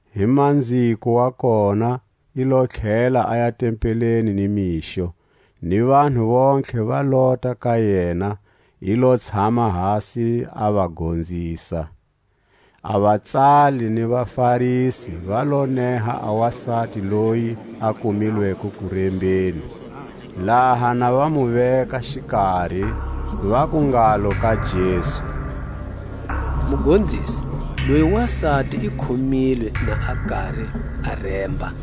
Hi manziko wa kona i lo tlhela aya tempeleni ni mixo, ni vanhu vontlhe va lota ka yena; i lo tshama hasi a va gonzisa. A vatsali ni vaFarisi va lo neha a wasati loyi a kumilweko kurembeni. Laha na va mu veka xikari, vaku ngalo ka Jesu: Mugonzisi, loyi wasati i khomilwe na a kari a remba.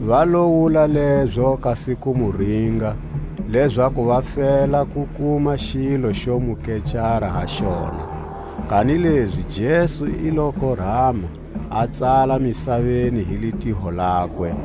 Va lo wula lezo kasi ku mu ringa, lezaku va fela ku kuma xilo xo mu kecara ha xona. Kanilezi Jesu i lo korama, a tsala misaveni hi litiho lakwe.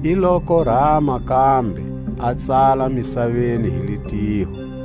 I lo korama kambe, a tsala misaveni hi litiho.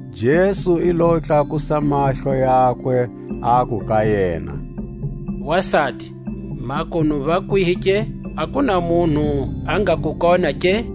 Jesu i lo tlakusa mahlo yakwe, aku ka yena: Wasati, makunu va kwihi ke? A ku na munhu a nga ku kona ke?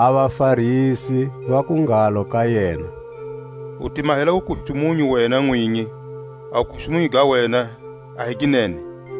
A vaFarisi vaku ngalo ka yena: U ti mahela wukustumunyu wena nwinyi; a wukustumunyu ga wena a hi ginene.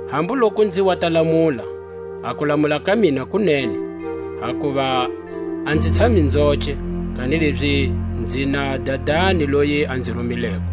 Hambu loku nzi wa ta lamula, a kulamula ka mina ku nene; hakuva a nzi tshami nzoce, kanilezi nzi na Dadani loyi a nzi rumileko.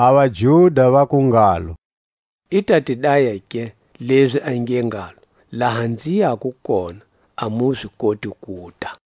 A vaJuda vaku ngalo: I ta ti daya ke, lezi a nge ngalo: Laha nzi yako kona, a mu zi koti kuta?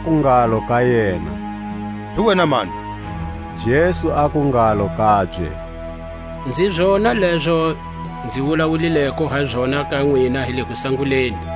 Vaku ngalo ka yena: Hi wena mani? Jesu aku ngalo kabye: Nzi zona lezo nzi wulawulileko ha zona ka nwina hi le kusanguleni.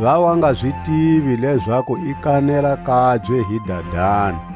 Va wa nga zi tivi lezaku i kanela kabye hi Dadani.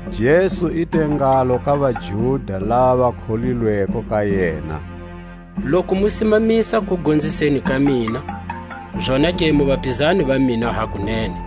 Jesu i te ngalo ka vaJuda lava va kholilweko ka yena: Loku mu simamisa kugonziseni ka mina, zonake mu vapizani va mina hakunene;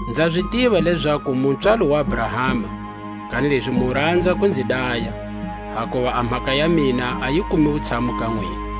Nza zi tiva lezaku mu pswalo wa Abrahama; kanilezi mu ranza ku nzi daya, hakuva a mhaka ya mina a yi kumi wutshamu ka nwina.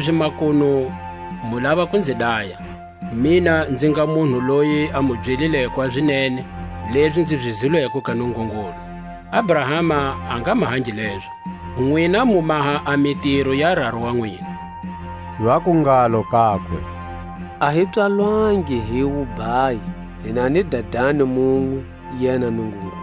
Kanilezi makunu mu lava ku nzi daya, mina nzi nga munhu loyi a mu byelileko a zinene, lezi nzi zi zwileko ka Nungungulu; Abrahama a nga mahangi lezo. Nwina mu maha a mitiro ya raru wa nwina. Vaku ngalo kakwe: A hi pswalwangi hi wubhayi; hi na ni Dadani munwe, yena Nungungulu.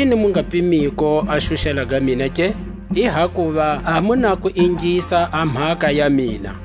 Hiyini mu nga pimiko a xuxela ga mina ke? I hakuva a mu na ku ingisa a mhaka ya mina.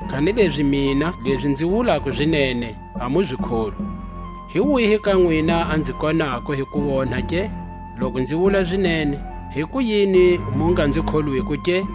Kanilezi mina, lezi nzi wulako zinene, a mu nzi kholwi. Hi wihi ka nwina a nzi konako hi kuonha ke? Loku nzi wula zinene, hikuyini mu nga nzi kholwiko ke?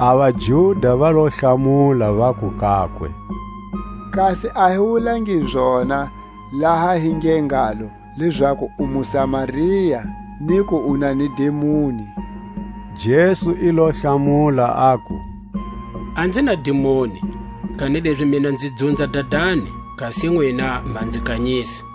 A vaJuda va lo hlamula, vaku kakwe: Kasi a hi wulangi zona, laha hi nge ngalo, lezaku u muSamaria, ni ku u na ni dimoni? Jesu i lo hlamula, aku: A nzi na dimoni; kanilezi mina nzi dzunza Dadani, kasi nwina ma nzi kanyisa.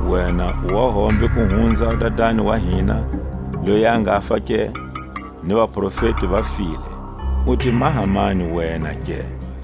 Wena u wa hombe ku hunza a dadani wa hina, loyi a ngafa ke? Ni vaprofeti va file; u ti maha mani wena ke?